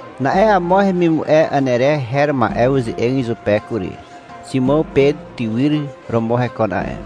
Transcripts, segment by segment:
Na'e amo hemimu'e Anere her ma'e uze'eg izupe kury. Ximàw Pet tywyr romo hekon a'e.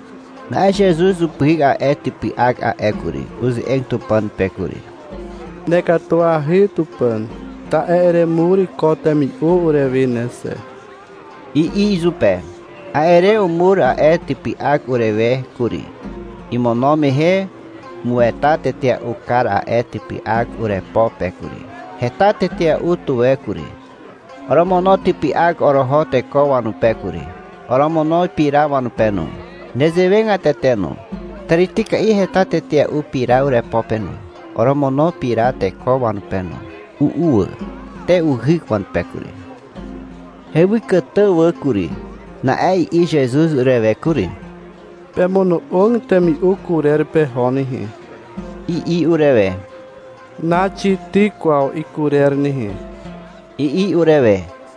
Na'e Zezuz upyhyk a'e typy'ak a'e kury. Uze'eg Tupàn pe kury. — Nekatuahy Tupàn, ta'e eremur ko temi'u urewe ne xe, i'i izupe. A'e re umur a'e typy'ak urewe kury. Imono mehe umueta tetea'u kar a'e typy'ak urepo pe kury. Heta tetea'u tuwe kury. Oromono typy'ak oroho teko wanupe kury. Oromono pira wanupe no. Nezewegatete no. Tàrityka'i heta tetea'u pira urepo pe no. Oromono pira teko wanupe no. U'u wà. Te uhyk wanupe kury. Hewykàtà wà kury. Na'e i'i Zezuz urewe kury. — Pemono'og temi'u kurer peho nehe, i'i urewe. — Naxityk kwaw ikurer nehe, i'i urewe.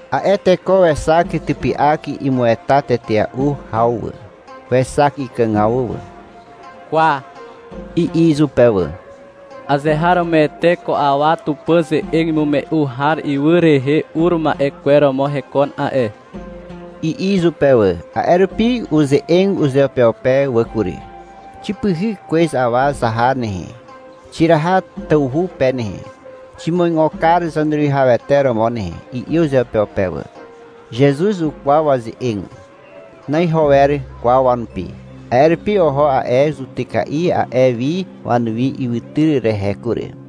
A'e teko wexak typy'ak imueta tetea'u haw wà. Wexak ikàgaw wà. — Kwa, i'i izupe wà. — Azeharomoete ko awa Tupàn ze'eg imume'u har ywy rehe ur ma'e kwer romo hekon a'e, i'i izupe wà. A'e rupi uze'eg uzeupeupe wà kury. — Xipyhyk kwez awa zaha nehe, xiraha tawhu pe nehe. Ximuigo kar Zaneruwihawete romo nehe, i'i uzeupeupe wà. Zezuz ukwaw waze'eg. Na'iho wer kwaw wanupi, a'e rupi oho a'e zutyka'i a'e wi wanuwi ywytyr rehe kury.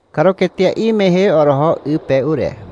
Karuketea'i mehe oroho 'y pe ure.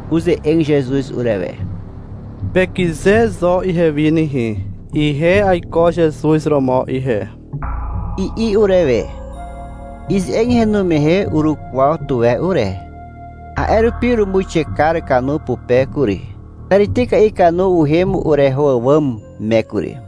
Uze'eg Zezuz urewe. — Pekyze zo ihewi nehe. Ihe aiko Zezuz romo ihe, i'i urewe. Ize'eg henu mehe urukwaw tuwe ure. A'e rupi urumuixe kar kanu pupe kury. Tàrityka'i kanu uhem ureho àwàm me kury.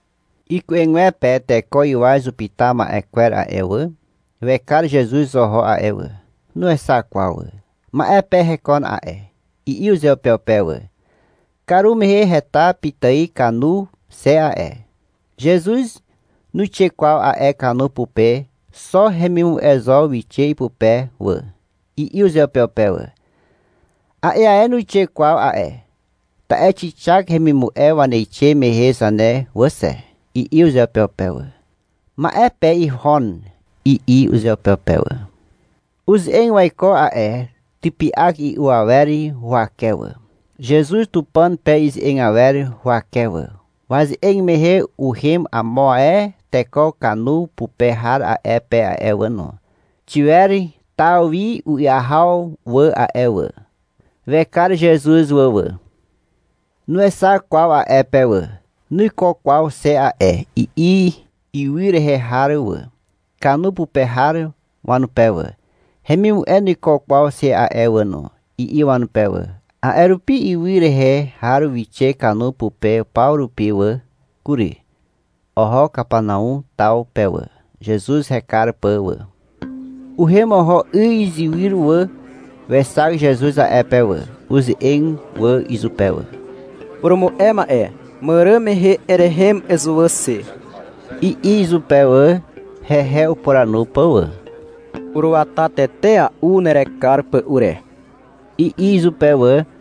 Iku'egwepe teko 'ywaz upyta ma'e kwer a'e wà, wekar Zezuz oho a'e wà. Nuexak kwaw wà. — Ma'e pe hekon a'e, i'i uzeupeupe wà. — Karumehe heta pitài kanu xe a'e. Zezuz nuixe kwaw a'e kanu pupe. Xo hemimu'e zo wixe ipupe wà, i'i uzeupeupe wà. — A'e ae nuixe kwaw a'e, ta'e xixak hemimu'e waneixe mehe zane wà xe, i'i uzeupeupe wà. — Ma'e pe ihon, i'i uzeupeupe wà. Uze'eg waiko a'e typy'ak i'u awer huwake wà, Zezuz Tupàn pe ize'eg awer huwake wà. Waze'eg mehe uhem amo ae teko kanu pupe har a'e pe a'e wà no. Xiwer taw wi u'yahaw wà a'e wà. Wekar Zezuz wà wà. Nuexak kwaw a'e pe wà. — Nuiko kwaw xe a'e, i'i ywy rehe har wà, kanu pupe har wanupe wà. — Hemimu'e nuiko kwaw xe a'e wà no, i'i wanupe wà. A'e rupi ywy rehe har wixe kanu pupe paw rupi wà kury. Oho Kapanau taw pe wà, Zezuz hekar pà wà. Uhem oho 'y izywyr wà. Wexak Zezuz a'e pe wà. Uze'eg wà izupe wà. — Purumu'e ma'e, màràn mehe erehem ezuwà xe, i'i izupe wà, hehe upuranu pà wà. — Uruata tetea'u nerekar pà ure, i'i izupe wà.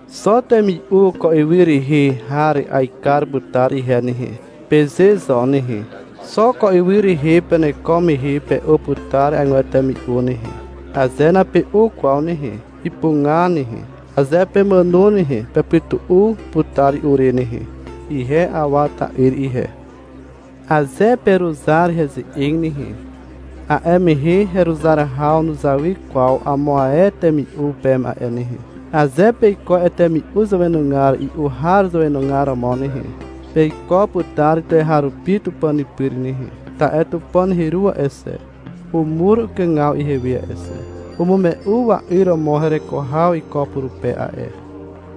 — Xo temi'u ko ywy rehe har aekar putar ihe nehe, peze zo nehe. Xo ko ywy rehe peneko mehe pe'u putar agwer temi'u nehe. Aze nape'u kwaw nehe, ipuga nehe. Aze pemàno nehe, pepytu'u putar i'u re nehe. Ihe Awa ta'yr ihe. Aze peruzar heze'eg nehe, a'e mehe heruzar haw nuzawy kwaw amo ae temi'u peme a'e nehe. Aze peiko a'e temi'u zàwenugar i'u har zàwenugar romo nehe, peiko putar tuweharupi Tupàn pyr nehe, ta'e Tupàn heru a'e xe, umur ukàgaw ihewe a'e xe. Umume'u wa'yr romo hereko haw iko purupe a'e.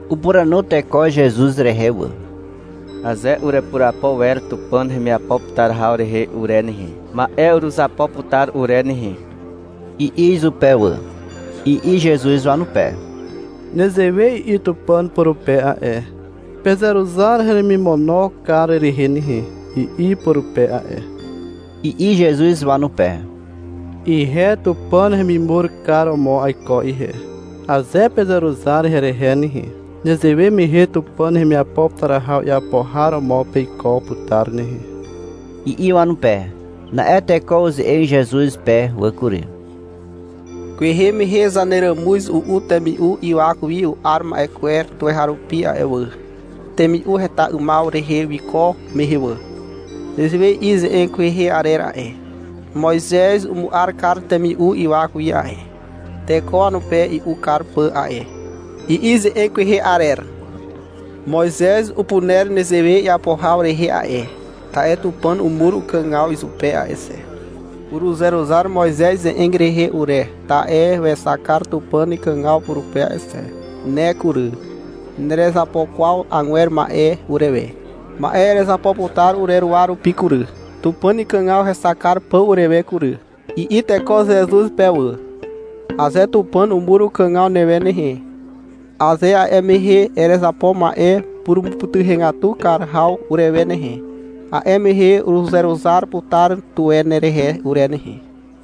Upuranu teko Zezuz rehe wà. — Aze urepurapo wer Tupàn hemiapo putar haw rehe ure nehe, ma'e uruzapo putar ure nehe, i'i izupe wà. I'i Zezuz wanupe. — Nezewe i'i Tupàn purupe a'e. — Pezeruzar heremimono kar rehe nehe, i'i purupe a'e, i'i Zezuz wanupe. — Ihe Tupàn hemimur kar romo aiko ihe. Aze pezeruzar herehe nehe, nezewe mehe Tupàn hemiapo putar haw iapo har romo peiko putar nehe, i'i wanupe. Na'e teko uze'eg Zezuz pe wà kury. — Kwehe mehe zaneràmuz u'u temi'u ywak wi u'ar ma'e kwer tuweharupi a'e wà, temi'u heta 'ymaw rehe wiko mehe wà. Nezewe i'i ze'eg kwehe arer a'e. — Moizez umu'ar kar temi'u ywak wi a'e, teko wanupe i'u kar pà a'e, i'i ze'eg kwehe arer. Moizez upuner nezewe iapo haw rehe a'e, ta'e Tupàn umur ukàgaw izupe a'e xe. Uruzeruzar Moizez ze'eg rehe ure, ta'e wexak kar Tupàn ikàgaw purupe a'e xe. Ne kury, nerezapo kwaw agwer ma'e urewe. Ma'e erezapo putar ureruwa rupi kury, Tupàn ikàgaw hexak kar pà urewe kury, i'i teko Zezuz pe wà. — Aze Tupàn umur ukàgaw newe nehe, aze a'e mehe erezapo ma'e purumupytuhegatu kar haw urewe nehe, a'e mehe uruzeruzar putar tuwe nerehe ure nehe.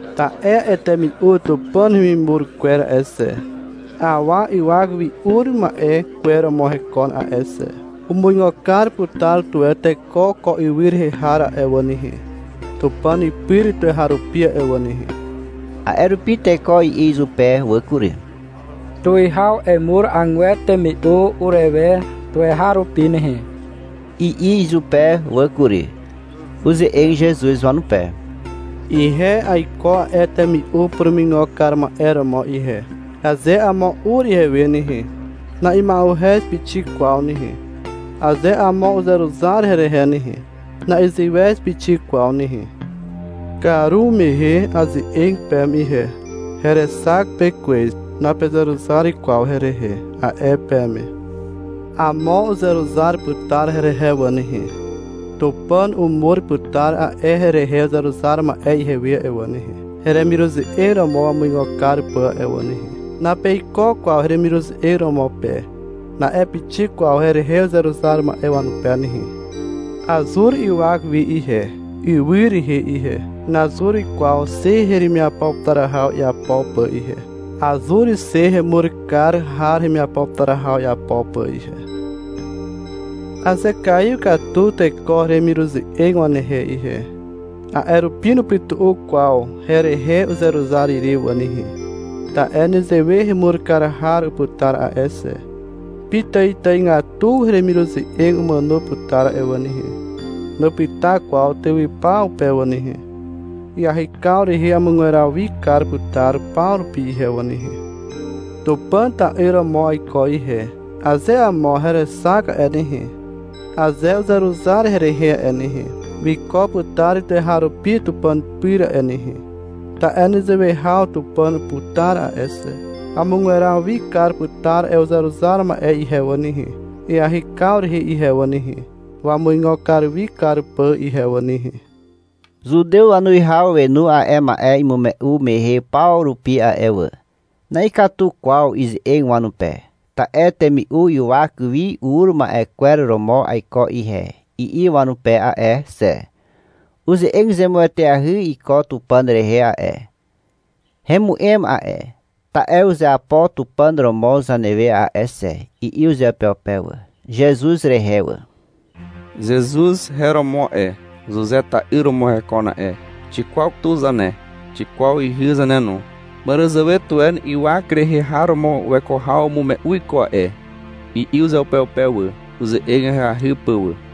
Ta'e a'e temi'u Tupàn hemimur kwer a'e xe, awa ywak wi ur ma'e kwer romo hekon a'e xe. Umuigo kar putar tuwe teko ko ywy rehe har a'e wà nehe, Tupàn pyr tuweharupi a'e wà nehe. A'e rupi teko i'i izupe wà kury. — Tuwihaw, emur agwer temi'u urewe tuweharupi nehe, i'i izupe wà kury. Uze'eg Zezuz wanupe. — Ihe aiko a'e temi'u purumuigo kar ma'e romo ihe. Aze amo ur ihewe nehe, na'ima'uhez pixik kwaw nehe. Aze amo uzeruzar herehe nehe, na'iziwez pixik kwaw nehe. Karumehe aze'eg peme ihe. — Herexak pe kwez, napezeruzar kwaw herehe, a'e peme. Amo uzeruzar putar herehe wà nehe. Tupàn umur putar a'e herehe uzeruzar ma'e ihewe a'e wà nehe, heremiruze'eg romo wamuigo kar pà a'e wà nehe. — Napeiko kwaw heremiruze'eg romo pe, na'e pixik kwaw herehe uzeruzar ma'e wanupe nehe. Azur ywak wi ihe, ywy rehe ihe. Nazur kwaw xe heremiapo putar haw iapo pà ihe. Azur xe hemur kar har hemiapo putar haw iapo pà ihe. Azekaiw katu teko heremiruze'eg wanehe ihe. A'e rupi nupytu'u kwaw herehe uzeruzar ire wà nehe. Ta'e nezewe hemur kar har uputar a'e xe. Pitàitàigatu heremiruze'eg umàno putar a'e wà nehe. Nupyta kwaw tywypaw pe wà nehe. Iahykaw rehe amugweraw wi kar putar paw rupi ihe wà nehe. Tupàn ta'yr romo aiko ihe. Aze amo herexak a'e nehe, aze uzeruzar herehe a'e nehe, wiko putar tuweharupi Tupàn pyr a'e nehe, ta'e nezewe haw Tupàn uputar a'e xe. Amugweraw wi kar putar a'e uzeruzar ma'e ihe wà nehe, iahykaw rehe ihe wà nehe, wamuigo wi kar pà ihe wà nehe. (Zutew wanuwihaw wenu a'e ma'e imume'u mehe paw rupi a'e wà.) Na'ikatu kwaw ize'eg wanupe, ta'e — Temi'u ywak wi ur ma'e kwer romo aiko ihe, i'i wanupe a'e xe. (— Uze'eg zemueteahy iko Tupàn rehe a'e, hemu'em a'e, ta'e uzeapo Tupàn romo zanewe a'e xe, i'i uzeupeupe wà, Zezuz rehe wà.) — Zezuz her romo a'e. Zuze ta'yr romo hekon a'e. Xikwaw tu zane, xikwaw ihy zane no. Màràzàwe tuwe ywak rehe har romo weko haw umume'u iko a'e, i'i uzeupeupe wà, uze'eg ahyahy pà wà.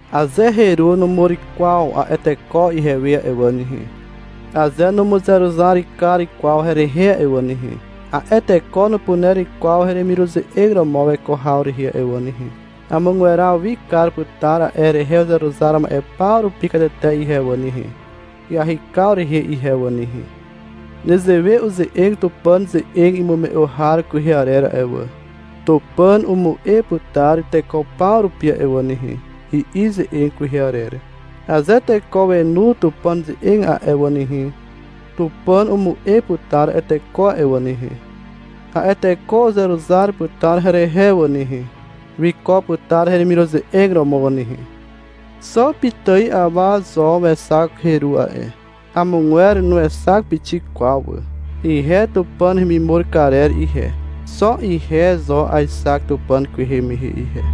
Aze heru numur kwaw a'e teko ihewe a'e wà nehe, aze numuzeruzar kar kwaw herehe a'e wà nehe, a'e teko nupuner kwaw heremiruze'eg romo weko haw rehe a'e wà nehe. Amugweraw wi kar putar a'e herehe uzeruzar ma'e paw rupi katete ihe wà nehe, iahykaw rehe ihe wà nehe. Nezewe uze'eg Tupàn ze'eg imume'u har kwehe arer a'e wà. — Tupàn umu'e putar teko paw rupi a'e wà nehe, i'i ze'eg kwehe arer. Aze teko wenu Tupàn ze'eg a'e wà nehe, Tupàn umu'e putar a'e teko a'e wà nehe. A'e teko uzeruzar putar herehe wà nehe, wiko putar heremiruze'eg romo wà nehe. Xo pitài awa zo wexak heru a'e. Amogwer nuexak pixik kwaw wà. Ihe Tupàn hemimur karer ihe, xo ihe zo aexak Tupàn kwehe mehe ihe.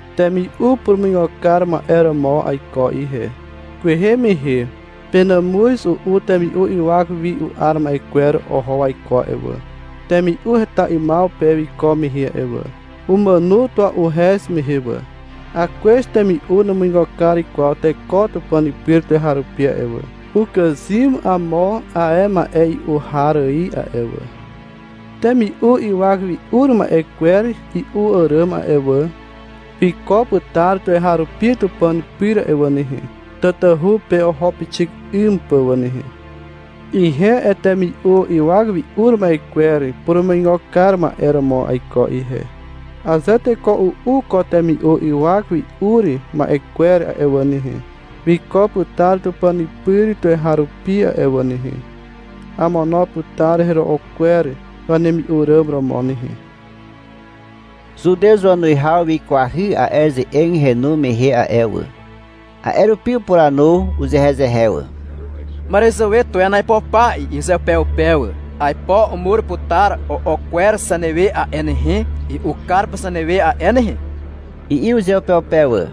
Temi'u purumuigo kar ma'e romo aiko ihe. Kwehe mehe penàmuz u'u temi'u ywak wi u'ar ma'e kwer oho waiko a'e wà, temi'u heta 'ymaw pe wiko mehe a'e wà. Umàno tua'uhez mehe wà. (Akwez temi'u numuigo kar kwaw teko Tupàn pyr tuweharupi a'e wà. Ukàzym amo ae ma'e i'u har ài a'e wà.) Temi'u ywak wi ur ma'e kwer i'u àràm a'e wà, wiko putar tuweharupi (Tupàn pyr) a'e wà nehe, (tatahu pe oho pixik 'ym pà wà nehe). Ihe a'e temi'u ywak wi ur ma'e kwer purumuigo kar ma'e romo aiko ihe. Aze teko u'u ko temi'u ywak wi ur ma'e kwer a'e wà nehe, wiko putar (Tupàn pyr) tuweharupi a'e wà nehe. Amono putar hero'o kwer wanemi'u ràm romo nehe. Zutew wanuwihaw wikwahy a'e ze'eg henu mehe a'e wà. A'e rupi upuranu uzehezehe wà. — Màràzàwe tuwen aipo pa, i'i uzeupeupe wà. — Aipo umur putar o'o kwer zanewe a'e nehe, i'u kar pà zanewe a'e nehe, i'i uzeupeupe wà.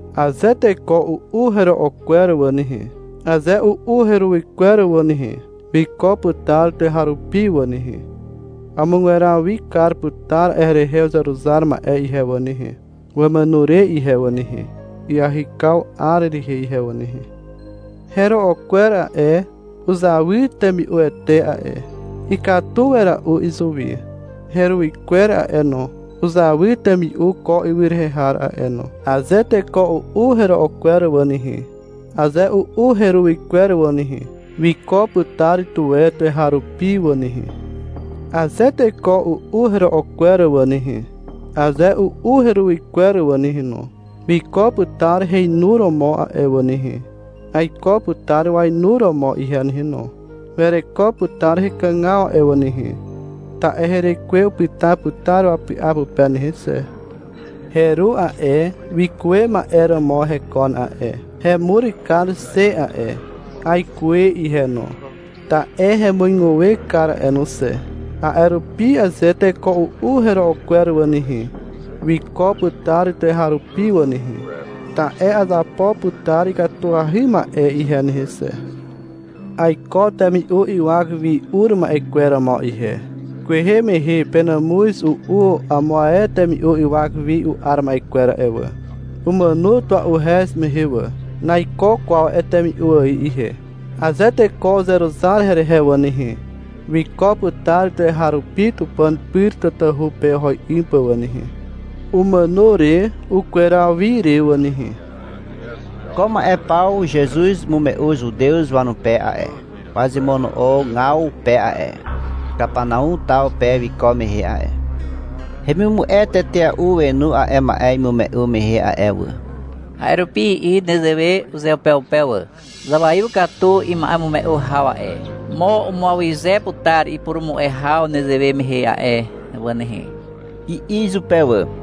Aze teko u'u hero'o kwer wà nehe, aze u'u heruwy kwer wà nehe, wiko putar tuweharupi wà nehe. Amugweraw wi kar putar a'e herehe uzeruzar ma'e ihe wà nehe, (wamàno re ihe wà nehe), iahykaw 'ar rehe ihe wà nehe. Hero'o kwer a'e, uzawy temi'uete a'e. Ikatu wera'u izuwi. Heruwy kwer a'e no, uzawy temi'u ko ywy rehe har a'e no. Aze teko u'u hero'o kwer wà nehe, aze u'u heruwy kwer wà nehe, wiko putar tuwe tuweharupi wà nehe. Aze teko u'u hero'o kwer wà nehe, aze u'u heruwy kwer wà nehe no, wiko putar heinuromo a'e wà nehe. Aiko putar wainuromo ihe nehe no. (Wereko putar hekàgaw a'e wà nehe, ta'e herekwe upyta putar wapy'a pupe nehe xe.) Heru a'e, wikuwe ma'e romo hekon a'e. Hemur kar xe a'e. Aikuwe ihe no, ta'e hemuiguwe kar a'e no xe. A'e rupi aze teko u'u hero'o kwer wà nehe, wiko putar tuweharupi wà nehe, ta'e azapo putar ikatuahy ma'e ihe nehe xe. Aiko temi'u ywak wi ur ma'e kwer romo ihe. Kwehe mehe penàmuz u'u amo ae temi'u ywak wi u'ar ma'e kwer a'e wà. Umàno tua'uhez mehe wà. Naiko kwaw a'e temi'u ài ihe. Aze teko uzeruzar herehe wà nehe, wiko putar tuweharupi (Tupàn pyr tatahu pe oho 'ym pà wà nehe, umàno re ukweraw wi re wà nehe). Ko ma'e paw Zezuz umume'u Zutew wanupe a'e, wazemono'ogaw pe a'e, Kapanau taw pe wiko mehe a'e. Hemimu'e tetea'u wenu a'e ma'e imume'u mehe a'e wà. A'e rupi i'i nezewe uzeupeupe wà. — Zawaiw katu ima'emume'u haw a'e. Mo umuawyze putar ipurumu'e haw nezewe mehe a'e wà nehe, i'i izupe wà.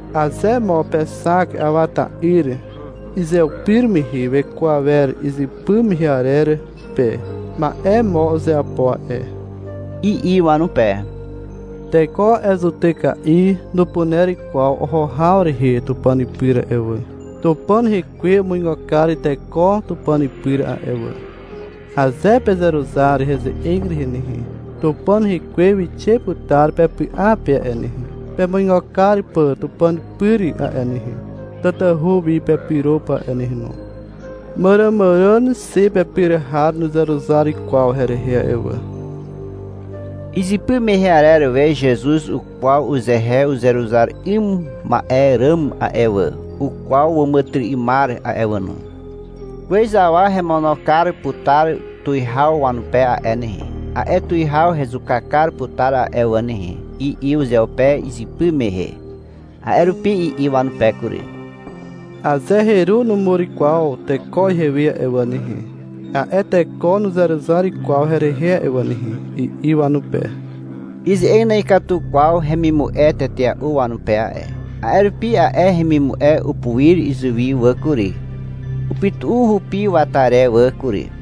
Aze mo pexak awa ta'yr izeupir mehe weko awer izypy mehe arer pe, ma'e mo uzeapo a'e, i'i wanupe. Teko a'e zutyka'i nupuner kwaw oho haw rehe (Tupàn pyr) a'e wà. Tupàn rekwe umuigo kar teko (Tupàn pyr a'e wà). Aze pezeruzar heze'eg rehe nehe, Tupàn rekwe wixe putar pepy'a pe a'e nehe, pemuigo kar pà (Tupàn pyr a'e nehe, tatahu wi pepyro pà a'e nehe no). Màràmàràn xe pepyr har nuzeruzar kwaw herehe a'e wà. Izypy mehe arer we Zezuz ukwaw uzehe uzeruzar 'ym ma'e ràm a'e wà. Ukwaw wàmàtyry'ymar a'e no. (— Kwez awa hemono putar tuwihaw wanupe a'e nehe. A'e tuwihaw hezuka kar putar a'e wà nehe, i'i uzeupe izypy mehe.) A'e rupi i'i wanupe kury. — Aze heru numur kwaw teko ihewe a'e wà nehe, a'e teko nuzeruzar kwaw herehe a'e wà nehe, i'i wanupe. Ize'eg na'ikatu kwaw hemimu'e tetea'u wanupe a'e. A'e rupi a'e hemimu'e upuir izuwi wà kury. Upytu'u hupi wata re wà kury.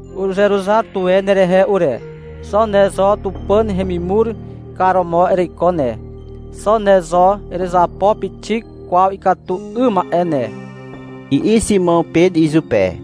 Uruzeruzar tuwe nerehe ure. Xo ne zo Tupàn hemimur kar romo ereiko ne. Xo ne zo nerezapo pixik kwaw ikatu 'ym ma'e ne, i'i Ximàw Pet izupe.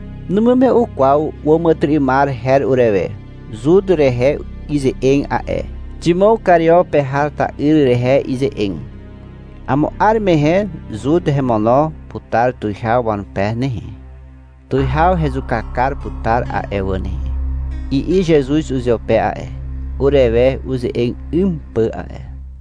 Numume'u kwaw wàmàtyry'ymar her urewe. Zut rehe ize'eg a'e. Ximàw Kario pe har ta'yr rehe ize'eg. — Amo 'ar mehe Zut hemono putar tuwihaw wanupe nehe. Tuwihaw hezuka kar putar a'e wà nehe, i'i Zezuz uzeupe a'e, urewe uze'eg 'ym pà a'e.